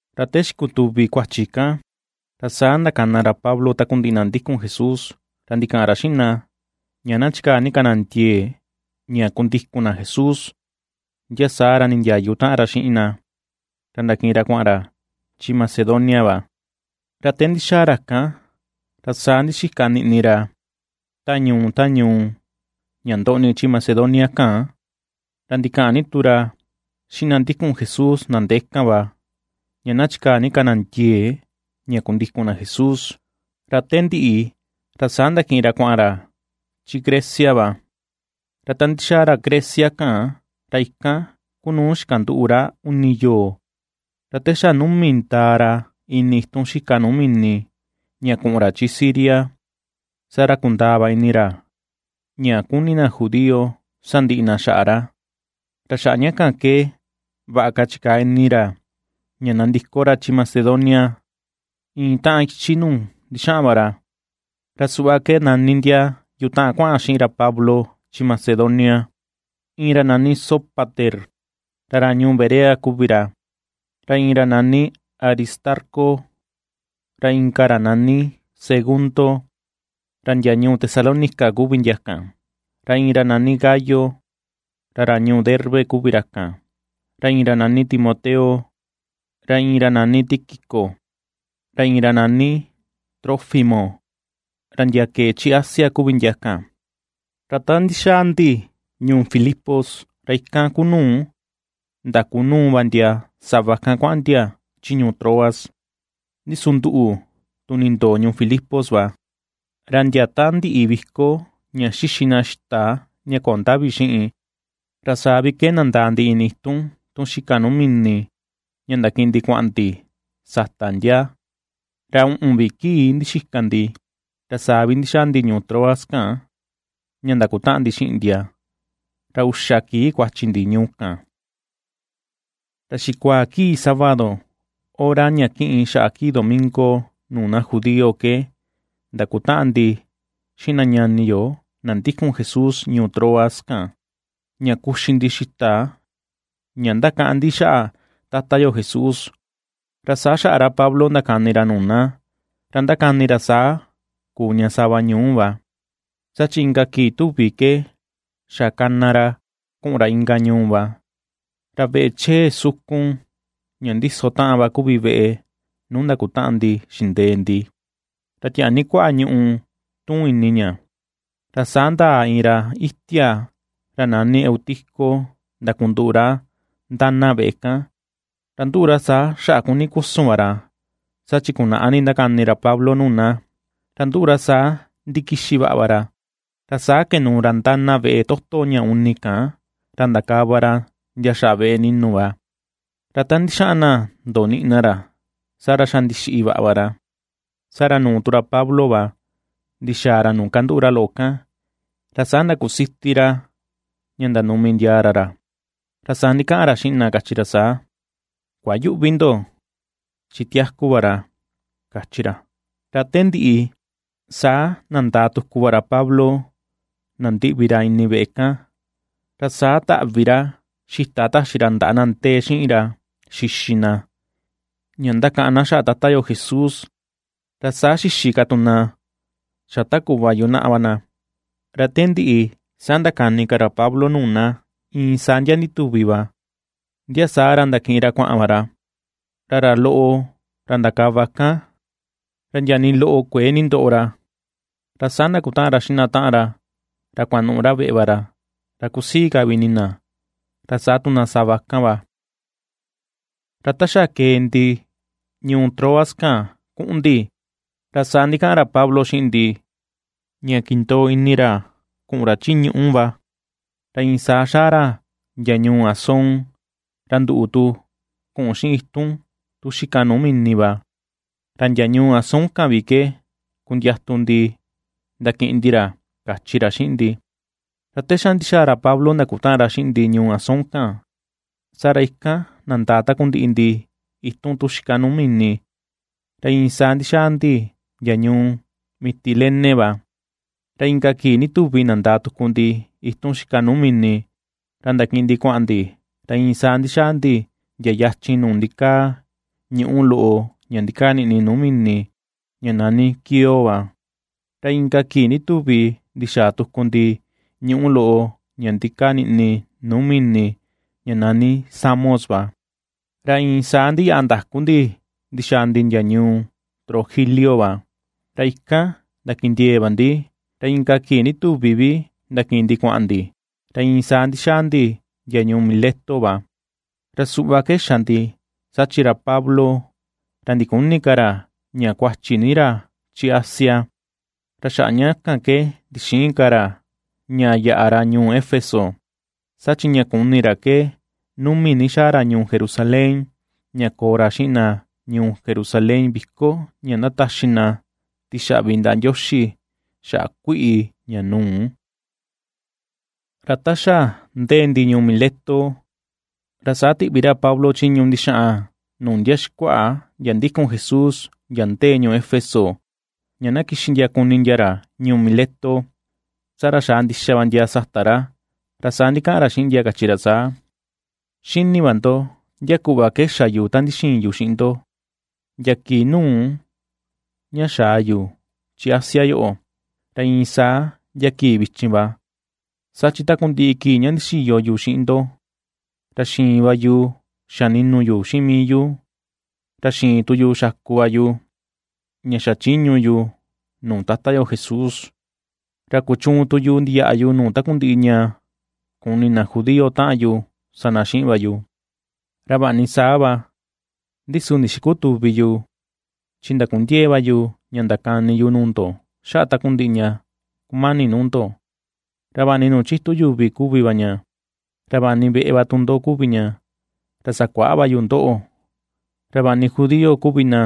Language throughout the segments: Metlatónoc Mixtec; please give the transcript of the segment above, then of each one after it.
Ra te xikutuvi kuachi kan, ra saa ndakana ra Pablo takundiꞌi na ndikun Jesús, ra ndikaꞌan ra xiꞌin na ña na chikaa ni ka na ndiee ña kundikun na Jesús. Ndia saa ra nindiayu taꞌan ra xiꞌin na, ra ndakiꞌin ra kuaꞌan ra chi Macedonia va. Ra te ndixaa ra kan, ra saa ndixika niꞌni ra, ta ñuu ta ñuu ña ndoꞌni chi Macedonia kan, ra ndikaꞌan ni tu ra xiꞌin na ndikun Jesús na ndee kan va, ña na chikaa ni ka na ndiee ña kundikun na Jesús, ra te ndiꞌi, ra saa ndakiꞌin ra kuaꞌan ra chi Grecia va. Ra ta ndixaa ra Grecia kan, ra ikan ku nuu xikanduꞌu ra uni yoo. Ra te xa numi ndaa ra ini itun xika nuu mini ña kuꞌun ra chi Siria, saa ra kundaa va ini ra ña kuni na judío sandiꞌi na xaꞌa ra. Ra xaꞌa ña kan ke, vaꞌa ka chikaa ini ra ña nandiko ra chi Macedonia iin taꞌan ichi nuu ndixaꞌan va ra. Ra suꞌva ke nani ndia yutaꞌan kuaꞌan xiꞌin ra Pablo chi Macedonia: iin ra nani Sópater, ra ra ñuu Berea kuvi ra, ra iin ra nani Aristarco, ra inka ra nani Segundo, ra ndia ñuu Tesalónica kuvi ndia kan, ra iin ra nani Gayo, ra ra ñuu Derbe kuvi ra kan, ra iin ra nani Timoteo, ra iin ra nani Tíquico, ra iin ra nani Trófimo, ra ndia kee chi Asia kuvi ndia kan. Ra ta ndixaa ndi ñuu Filipos, ra ikan kuu nuu ndakunuu va ndia sava kan kuaꞌan ndia chi ñuu Troas. Ndi su nduꞌu tu nindoo ñuu Filipos va, ra ndia ta ndiꞌi viko ña xixi na xita ña köo ndavi xiꞌin, ra saa vi ke nandaa ndi ini itun tun xika nuu mini ña ndakiꞌin ndi kuaꞌan ndi sata ndia, ra uꞌun vi kii ndixika ndi, ra saa vi ndixaa ndi ñuu Troas kan ña ndakutaꞌan ndi xiꞌin ndia, ra uxa kii kuachi ndi ñuu kan. Ra xikuaa kii sábado, hora ña kiꞌin xaꞌa kii domingo nuu na judío ke, ndakutaꞌan ndi xiꞌin na ñani yo, na ndikun Jesús ñuu Troas kan, ña kuxi ndi xita ña ndakaꞌan ndi xaꞌa Tata yo Jesús, ra saa xaꞌa ra Pablo ndakani ra nuu na, ra ndakani ra saa kuu ña sava ñuu va, saa chi inka kii tuvi ke xa kana ra kuꞌun ra inka ñuu va. Ra veꞌe chee sukun ña ndiso taꞌan va kuvi veꞌe nuu ndakutaꞌan ndi xindee ndi, ra tiaa ni kuaꞌa ñuꞌu tuun ini ña. Ra saa ndaa iin ra itia ra nani Eutico ndakunduꞌu ra ndana veꞌe kan. Ra nduꞌu ra saa xaꞌa kuni kusun va ra, saa chi kunaꞌa ni va ndakani ra Pablo nuu na. Ra nduꞌu ra saa ndikixi vaꞌa va ra, ra saa kenuu ra ndana veꞌe toto ña uni kan ndakava ra ndia xaꞌa veꞌe ni̱nu̱ va. Ra ta ndixaꞌan na ndoniꞌi na ra, saa ra xa ndixiꞌi vaꞌa va ra. Saa ra nuu tu ra Pablo va ndixaa ra nuu kanduꞌu ra loꞌo kan, ra saa ndakusiti ra ña ndanumi ndiaa ra ra, ra saa ndikaꞌan ra xiꞌin na, kachi ra saa: ―Kuayüꞌvi ndo, chi tiaku va ra ―kachi ra. Ra te ndiꞌi saa nandaa tuku va ra Pablo nandiꞌvi ra ini veꞌe kan, ra saa taꞌvi ra xita taxi ra ndaꞌa na ndee xiꞌin ra xixi na, ña ndakaꞌan na xaꞌa Tata yo Jesús, ra saa xixi ka tu na xa ta kuꞌva yunaꞌa va na. Ra te ndiꞌi saa ndakani ka ra Pablo nuu na iin saa ndia ndituvi va, ndia saa ra ndakiꞌin ra kuaꞌan va ra. Ra ra loꞌo ra ndakava kan, ra ndia nii loꞌo kuëe nindoꞌo ra, ra saa ndakutaꞌan ra xiꞌin na taꞌan ra kuanuꞌu ra veꞌe va ra, ra kusii ka vi ini na, ra saa tu na sava kan va. Ra ta xa kee ndi ñuu Troas kan kuꞌun ndi, ra saa ndikataꞌan ra Pablo xiꞌin ndi, ña kindoo ini ra kuꞌun ra chi ñuꞌu va, ra iin saa xaa ra ndia ñuu Asón, ra nduꞌu tu, kuꞌun xiꞌin itun tu xika nuu mini va, ra ndia ñuu Asón kan vi ke kundiatu ndi ndakiꞌin ndi ra, kachi ra xiꞌin ndi. Ra te xa ndixaa ra Pablo ndakutaꞌan ra xiꞌin ndi ñuu Asón kan, saa ra ikan nandaa takundiꞌi ndi itun tu xika nuu mini, ra iin saa ndixaa ndi ndia ñuu Mitilene va. Ra inka kii ndituvi nandaa tuku ndi itun xika nuu mini ra ndakiꞌin ndi kuaꞌan ndi, ra iin saa ndixaa ndi ndia yachin nuu ndikaa ñuꞌu loꞌo ña ndikaa niꞌni nuu mini ña nani Quío va, ra inka kii ndituvi ndixaa tuku ndi ñuꞌu loꞌo ña ndikaa niꞌni nuu mini ña nani Samos va. Ra iin saa ndiyaꞌa ndaku ndi ndixaa ndi ndia ñuu Trogilio va, ra ikan ndakindiee va ndi, ra inka kii ndituvi vi ndakiꞌin ndi kuaꞌan ndi, ra iin saa ndixaa ndi ndia ñuu Mileto va. Ra suꞌva ke xa ndi, saa chi ra Pablo ra ndiküni ka ra ña kuachi ni ra chi Asia, ra xaꞌa ña kan ke ndixïin ka ra ña yaꞌa ra ñuu Éfeso. Saa chi ña kuni ra ke numi ni na xaa ra ñuu Jerusalén ña koo ra xiꞌin na ñuu Jerusalén viko ña ndataxi na tixaꞌvi ndaꞌa Ndioxi xaꞌa kuiꞌi ña nuu. Ra ta xa ndee ndi ñuu Mileto, ra saa tiꞌvi ra Pablo chiñu ndixaꞌan nuu ndia xikuaꞌa ndia ndikun Jesús, ndia ndee ñuu Éfeso ña na kixi ndia kuni ndia ra ñuu Mileto. Saa ra xaa ndixa va ndia sata ra, ra saa ndikaꞌan ra xiꞌin ndia, kachi ra saa: ―Xini va ndo ndia kuꞌva ke xa yu ta ndixiin yu xiꞌin ndo, ndia kii nuu ña xaa yu chi Asia yoꞌo, ra iin saa ndia kii vichin va. Saa chi takundiꞌi kii ña ndixiyo yu xiꞌin ndo, ra xiin va yu xa ni̱nu̱ yu xiꞌin mii yu, ra xiin tu yu xaku va yu, ña xachiñu yu nuu Tata yo Jesús, ra kuchuun tu yu ndiyaꞌa yu nuu takundiꞌi ña kuni na judío taꞌan yu sa na xiꞌin va yu. Ra vaꞌa ni saa va, ndi su ndixikütuvi yu, chi ndakundiee va yu ña ndakani yu nuu ndo xaꞌa takundiꞌi ña kumani nuu ndo; ra vaꞌa ni nuu chitu yuvi kuvi ña, ra vaꞌa ni veꞌe va tu ndo kuvi ña, ra sakuaꞌa va yu ndoꞌo. Ra vaꞌa ni judío kuvi na,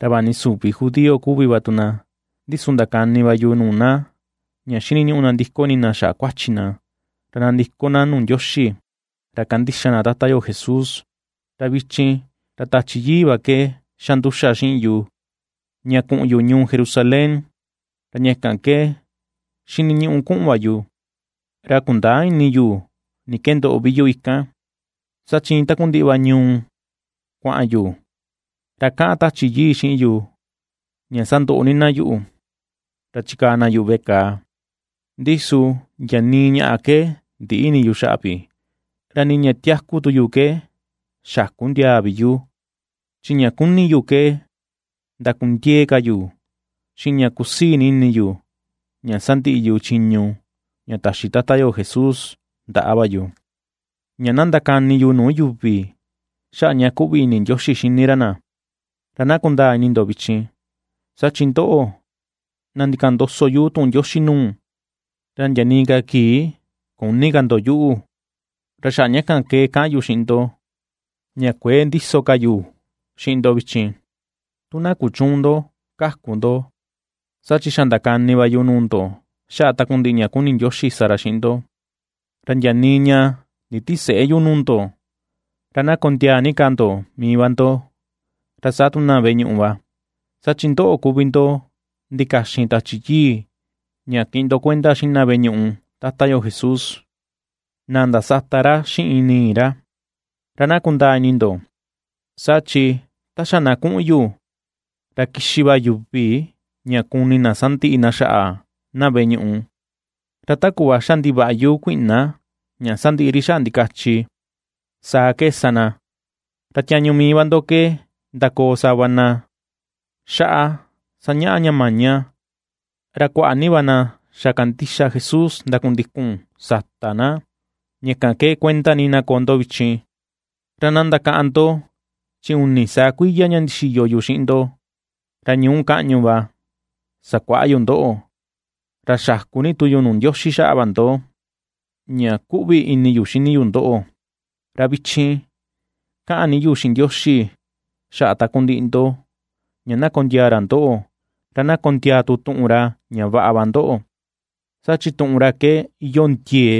ra vaꞌa ni süvi judío kuvi va tu na, ndi su ndakani va yu nuu na ña xiniñuꞌu na nandiko ini na xaꞌa kuachi na, ra nandiko na nuu Ndioxi, ra kandixa na Tata yo Jesús. Ra vichin, ra Tachi Yii va ke xa nduxa xiꞌin yu ña kuꞌun yu ñuu Jerusalén, ra ña kan ke xiniñuꞌu kuꞌun va yu, ra kundäa ini yu ni ke ndoꞌo vi yu ikan. Saa chi iin takundiꞌi va ñuu nuu kuaꞌan yu, ra kaꞌan Tachi Yii xiꞌin yu ña sandoꞌo ni na yuꞌu, ra chikaa na yuꞌu veꞌe kàà. Ndi su ndia nii ñaꞌa ke ndiꞌi ini yu xaꞌa vi, ra nii ña tiaku tu yu ke xäku ndiaa vi yu, chi ña kuni yu ke na ndakundiee ka yu xiꞌin ña kusii ini yu ña sandiꞌi yu chiñu ña taxi Tata yo Jesús ndaꞌa va yu, ña na ndakani yu nuu yuvi xaꞌa ña kuꞌvi ni ini Ndioxi xini ra na. ’Ra na kundaa ini ndo vichin, saa chi ndoꞌo, na ndikaꞌan ndoso yu tuꞌun Ndioxi nuu, ra ndia nii ka kii küni ka ndo yuꞌu. Ra xaꞌa ña kan ke kaꞌan yu xiꞌin ndo, ña kuëe ndiso ka yu xiꞌin ndo vichin, tu na kuchüun ndo kaku ndo. Saa chi xa ndakani va yu nuu ndo xaꞌa takundiꞌi ña kuni Ndioxi sa ra xiꞌin ndo, ra ndia nii ña nditisëꞌe yu nuu ndo. Ra na kondiaa ni ka ndo mii va ndo, ra saa tu na veꞌe ñuꞌu va, saa chi ndoꞌo kuvi ndo ndikaxin Tachi Yii ña kiꞌin ndo kuenda xiꞌin na veꞌe ñuꞌu Tata yo Jesús, na ndasata ra xiꞌin nii ra. Ra na kundaa ini ndo, saa chi ta xa na kuꞌun yu, ra kixi va yuvi ña kuni na sandiꞌi na xaꞌa na veꞌe ñuꞌu, ra ta kuꞌva xa ndivaꞌyu kuiꞌna ña sandiꞌi ri xaꞌa ndikachi, saa ke sa na. Ra tiañu mii va ndo ke ndakoo sava na xaꞌa sañaꞌa ña maña, ra kuaꞌa ni va na xa kandixa Jesús ndakundikun sata na. Ña kan ke kuenda ni na koo ndo vichin, ra na ndakaꞌan ndo chi uni saa kuiya ña ndixiyo yu xiꞌin ndo, ra ñuu kaꞌñu va sakuaꞌa yu ndoꞌo, ra xaku ni tu yu nuu Ndioxi va xaꞌa ndo ña kuꞌvi ini yu xini yu ndoꞌo. ’Ra vichin kaꞌan ni yu xiꞌin Ndioxi xaꞌa takundiꞌi ndo, ña na kondiaa ra ndoꞌo, ra na kondiaa tu tuꞌun ra ña vaꞌa va ndoꞌo, saa chi tuꞌun ra ke iyoo ndiee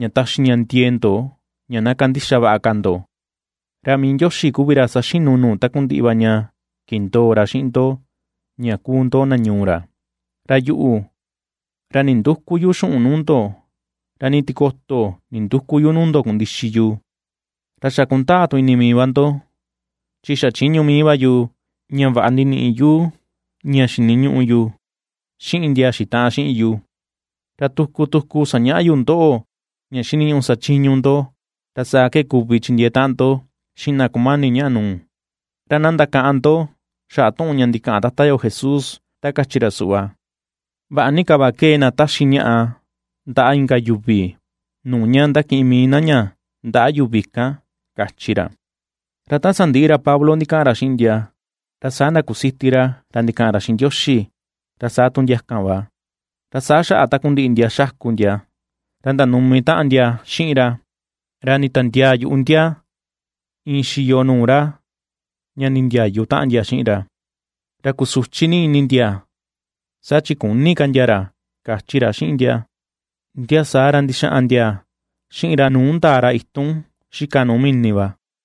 ña taxi ña ndiee ndo ña na kandixa vaꞌa ka ndo. Ra mii Ndioxi kuvi ra saxinu nuu takundiꞌi va ña kindoo ra xiꞌin ndo ña kuu ndo na ñuu ra. Ra yuꞌu, ra ndindüku yu xuꞌun nuu ndo, ra ni tikoto nindüku yu nuu ndo kundixi yu; ra xa kundaa tu ini mii va ndo, chi xachiñu mii va yu, ña vaꞌa ndiniꞌi yu ña xiniñuꞌu yu xiꞌin ndia xitaꞌan xiꞌin yu. Ra tuku tuku sañaꞌa yu ndoꞌo, ña xiniñuꞌu sachiñu ndo, ra saa ke kuvi chindiee taꞌan ndo xiꞌin na kumani ñaꞌa nuu. Ra na ndakaꞌan ndo xaꞌa tuꞌun ña ndikaꞌan Tata yo Jesús, ta kachi ra ra suꞌva: “Vaꞌa ni ka va kee na taxi ñaꞌa ndaꞌa inka yuvi, nuu ña ndakiꞌin mii na ña ndaꞌa yuvi kan”, ―kachi ra. Ra ta sandiꞌi ra Pablo ndikaꞌan ra xiꞌin ndia, ra saa ndakusiti ra, ra ndikaꞌan ra xiꞌin Ndioxi, ra saa tu ndia kan va. Ra saa xaꞌa takundiꞌi ndia xaku ndia, ra ndanumi taꞌan ndia xiꞌin ra, ra nditiandiaa yuꞌu ndia iin xiyo nuu ra ña ndindiayu taꞌan ndia xiꞌin ra. Ra kusuchi ni ini ndia, saa chi küni ka ndia ra, kachi ra xiꞌin na. Ndia saa ra ndixaꞌan ndia xiꞌin ra nuu ndaa ra itun xika nuu mini va.